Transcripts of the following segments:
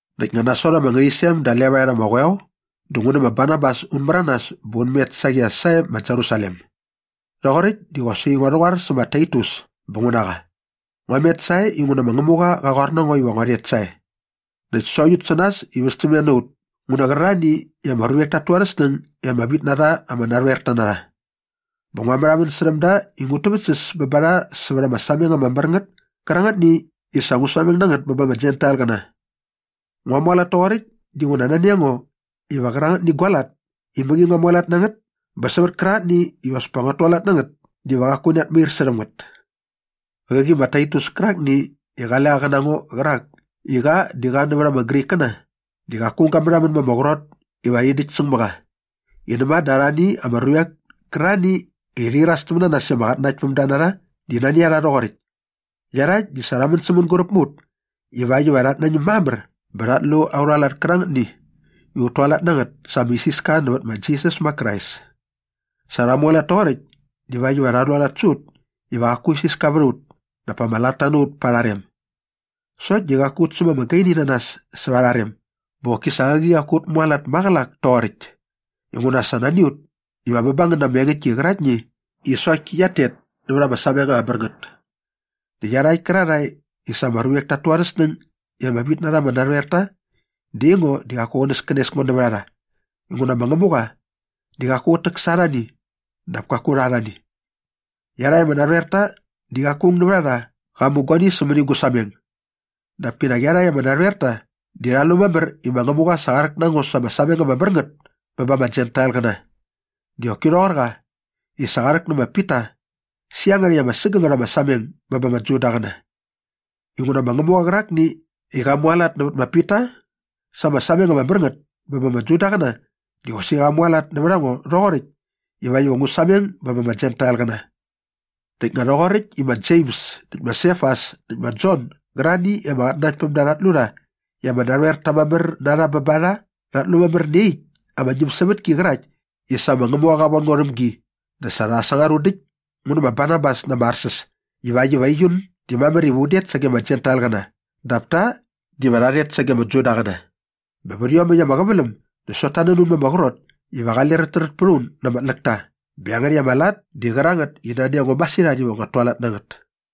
Näkt nga nasot ama ngärhäqyisem da levaet ama qoeo dä ngu nä ma Barnabas un märanas bä un met saqi as sae ma Jerusalem. Rhoqoräkt di qosaqi ngua rhäqoar sä ma Taitus bä ngu na qa. Ngua met sae inguna ma Ngämuqa qa qoar na ngo iva ngua rhet sae. Näkt sokt ut sä nas i västämne na ut ngu nä qärarhani i ama ruvek tat tu arhä snäng i ama vit na rha ama narhoerta na rha. Bä ngua märhamän särhäm da i ngut täväktsäs bä ba rha sävät ama sameng ama mär ngät kärangätni i sa ngu sameng na ngät bä ba ama Jentailqäna. Ngua mualat toqoräkt dinguna nani a ngo iva qärangätni gua lat i mäqi ngua mualat na ngät bä sävät kärangätni iva as pa nguat tualat na ngät diva qaku rhat tair särhäm ngät. Qäqi ma Taitus kärakni i qale qa qä na ngo qärak i qa di qa nävät ama Grikkäna di qaku aung ga märhamän ma ama qrot iva rhi däkt säng mä qa i näma dä arhani ama ruvek kärarhani i rhi iras täm na nas i ama qatnanaktpämda na rha di nani a rha rhoqoräkt. Iarhakt di sa rha män sä mänguräp mä ut ivakt iva rhat nañäm mamär bä rhat lu aurha lat kärangätni i ut tualat na ngät sa ama isiska nävät ma Jisas ma Krais. Sa rha mualat toqoräkt divakt iva rha rhualat sä ut iva qaku isiska vät a ut dap pa ama latta na ut pa arha rem. Sokt di qaku ut säm ama gaini na nas säva arha rem bä qoki sa qäqi qaku ut mualat maqälak toqoräkt inguna sa nani a ut iva bä ba ngän na ama engäktki qäraktni i sokt ki qiat tet nävät ama sameng ama mär ngät. Näkt iarhakt kärarhae i sa ama ruvek tat tu arhä snäng i ama vit na rha ama narhoerta di aingo di qaku qänäskänes ngo nävät a rha inguna ma Ngämuqa di qaku qät täk sa arhani dap kaku rha arhani. Iarhakt ama narhoerta di qaku aung nävät a rha qa mu guani sämäni gu sameng. Dap kinak iarhakt ama narhoerta di rha lu mamär i ma Ngämuqa sa qa rhäk na ngo sa ama sameng ama mär ngät bä ba ama Jentailqäna di qoki rhoqor qa i sa qa rhäk nä ma Pita sä iangärhäkt ama sägängät ama sameng bä ba ama Judaqäna. Inguna ma Ngämuqa qärakni i qa mualat nävät ma Pita sa ama sameng ama mär ngät bä ba ama Judaqäna di qosaqi qa mualat nävät a ngo rhoqoräkt ivakt iva ngu sameng bä ba ama Jentailqäna. Näkt nga rhoqoräkt i ma Jems näkt ma Sefas näkt ma Jon gärarhani i ama qatnanaktpämda rhat lu rha i ama narhoerta mamär na rha bä ba rha rhat lu mamär nä iaqyäkt ama ñämsävätki qärakt i sa ma Ngämuqa qa von ngo rhäm gi dä sa rha sangar un däkt ngu nä ma Barnabas na ama arsäs ivakt iva aiun di mamär iva un det sage ama Jentailqäna dap ta diva rha rhet sage ama Judaqäna. Bä vät iomäkt ama qäväläm dä sokt ta nän un ma ama qrot iva un diva qale räträt pät a un na ama tläkta bä iangärhäkt ama lat di qärangät i nani a ngo masirhat iva nguat tualat na ngät.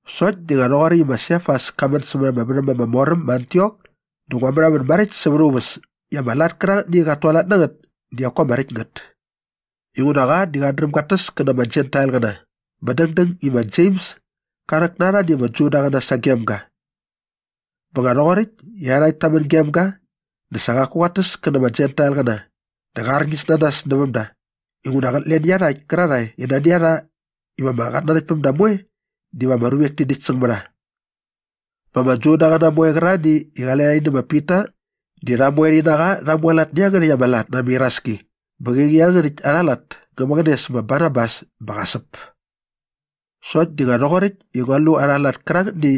Sokt di nga rhoqoräkt i ma Sefas ka män sämät ama värhäm ama mor äm ma Antiok dä ngua märhamän maräkt säva aa uväs i ama lat kärangätni i qat tualat na ngät di qaku ama räkt ngät. Inguna qa di qat dräm gat täs kä na ama Jentailqäna bä dängdäng i ma Jems ka rhäk na arhani ama Judaqäna sagem ga. Bä nga rhoqoräkt i iarhakt ta män gem ga dä sa qaku qat täs kä na ama Jentailqäna dä qa arñis na nas näväm da inguna qät len iarhakt kärarhae i nani a rha iva ama qatnanaktpämda moe diva ama ruvek ti däkt säng mä rha. Bä ama Judaqäna moe qärarhani i qale rha rhi nä ma Pita di rha moe rhi na qa rha mualat nä iangärhäkt ama lat na ama iraski bä qäqi iangärhäkt arha lat ngä mäqäne sä ma Barnabas bä qa säp. Sokt di nga rhoqoräkt i ngua lu arha lat kärangätni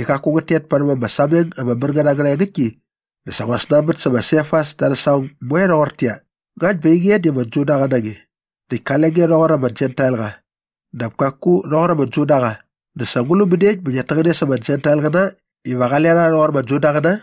i qaku ngät tet parhäm ama sameng ama mär ngät angärha engäktki dä sa ngua snanbät sä ma Sefas da arhä saqong moe doqortäqyia, “Ngakt bä ainge di ama Judaqa na nge näkt kale nge rhoqor ama Jentailqa dap kaku rhoqor ama Judaqa dä sa ngu lu mäniekt bä ngiat täqäne sa ama Jentailqäna iva qale rha rhoqor ama Judaqäna?”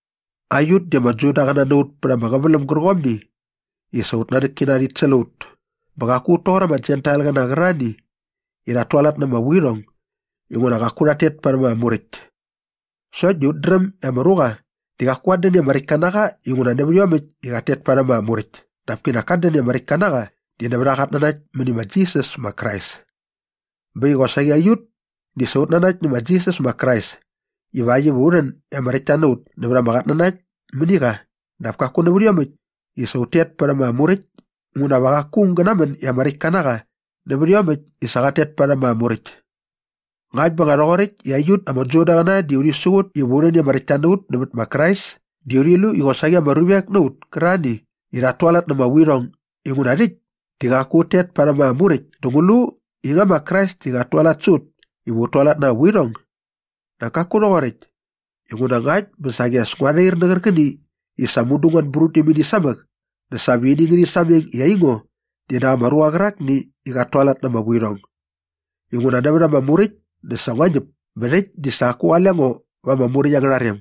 Aiut di ama Judaqäna na ut pät ama qäväläm gärqomni i sa aut nanäkkina rhit säl a ut bä qaku ut toqor ama Jentailqäna qärarhani i rhat tualat na ama vuirhong inguna qaku rhat tet parhäm ama Muräkt. Sokt di ut dräm i ama ruqa di qaku qat dän i ama räktka na qa inguna nävät iomäkt i qat tet parhäm ama Muräkt dap kinak kat dän i ama räktka na qa di nävät aa qatnanakt mäni ma Jisas ma Krais. Bä äkt i qosaqi aiut di sa ut nanakt nä ma Jisas ma Krais ivakt iva u rhän i ama räktta na ut nävät ama qatnanakt mäni qa dap kaku nävät iomäkt i sa ut tet parhäm ama Muräkt inguna va qaku aung gä namän i ama räktka na qa nävät iomäkt i sa qat tet parhäm ama Muräkt. Ngakt bä nga rhoqoräkt i aiut ama Judaqäna di urhi siqut iva u rhän i ama räktta na ut nävät ma Krais di urhi lu i qosaqi ama ruvek na ut kärarhani i rhat tualat na ama vuirhong inguna rhäkt di qaku ut tet parhäm ama Muräkt dä ngu lu i nga ma Krais di qat tualat sä ut iva ut tualat na ama vuirhong? Nak kaku rhoqoräkt. Inguna ngakt bä saqi as ngua rhair nä qärqäni i sa mudu ngua anbrut däm ini samäk dä sa va ini ngärhi sameng i aingo di nak ama ruqa qärakni i qat tualat na ama vuirhong. Inguna nävät ama Muräkt dä sa ngua ñäp bä rhäkt di sa qaku qale ngo va ama Muräkt angärha rem.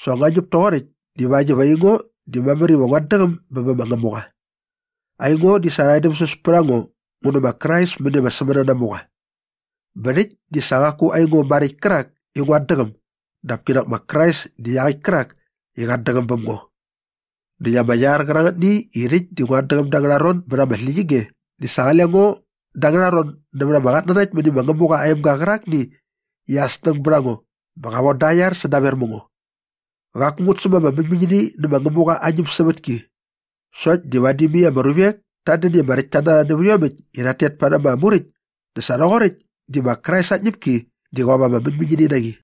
Sa ngua ñäp toqoräkt divakt iva aingo di mamär iva nguat däqäm bä bä ma Ngämuqa. Aingo di sa rha edämsäs pät a ngo ngu nä ma Krais mäni ama sämänanamuqa. Bä rhäkt di sa qaku aingo maräkt kärak i nguat däqäm dap kinak ma Krais di iaqäkt kärak i qat däqäm bäm ngo. Näkt ama iar qärangätni i rhäkt di nguat däqäm da angärha ron bät ama släqyige di sa qale ngo da angärha ron nävät ama qatnanakt mäni ma Ngämuqa aa emga qärakni i aa snäng bät a ngo bä qa von da aa iar sädaver mä ngo. Qaku ngut säm ama mäñmäñini nä ma Ngämuqa aa ñämsävätki. Sokt di vadi mai ama ruvek tat dän i ama räktta na rha nävät iomäkt i rhat tet parhäm ama Muräkt dä sa rhoqoräkt di ma Krais aa tñäpki diva qop ama mäñmäñini na qi.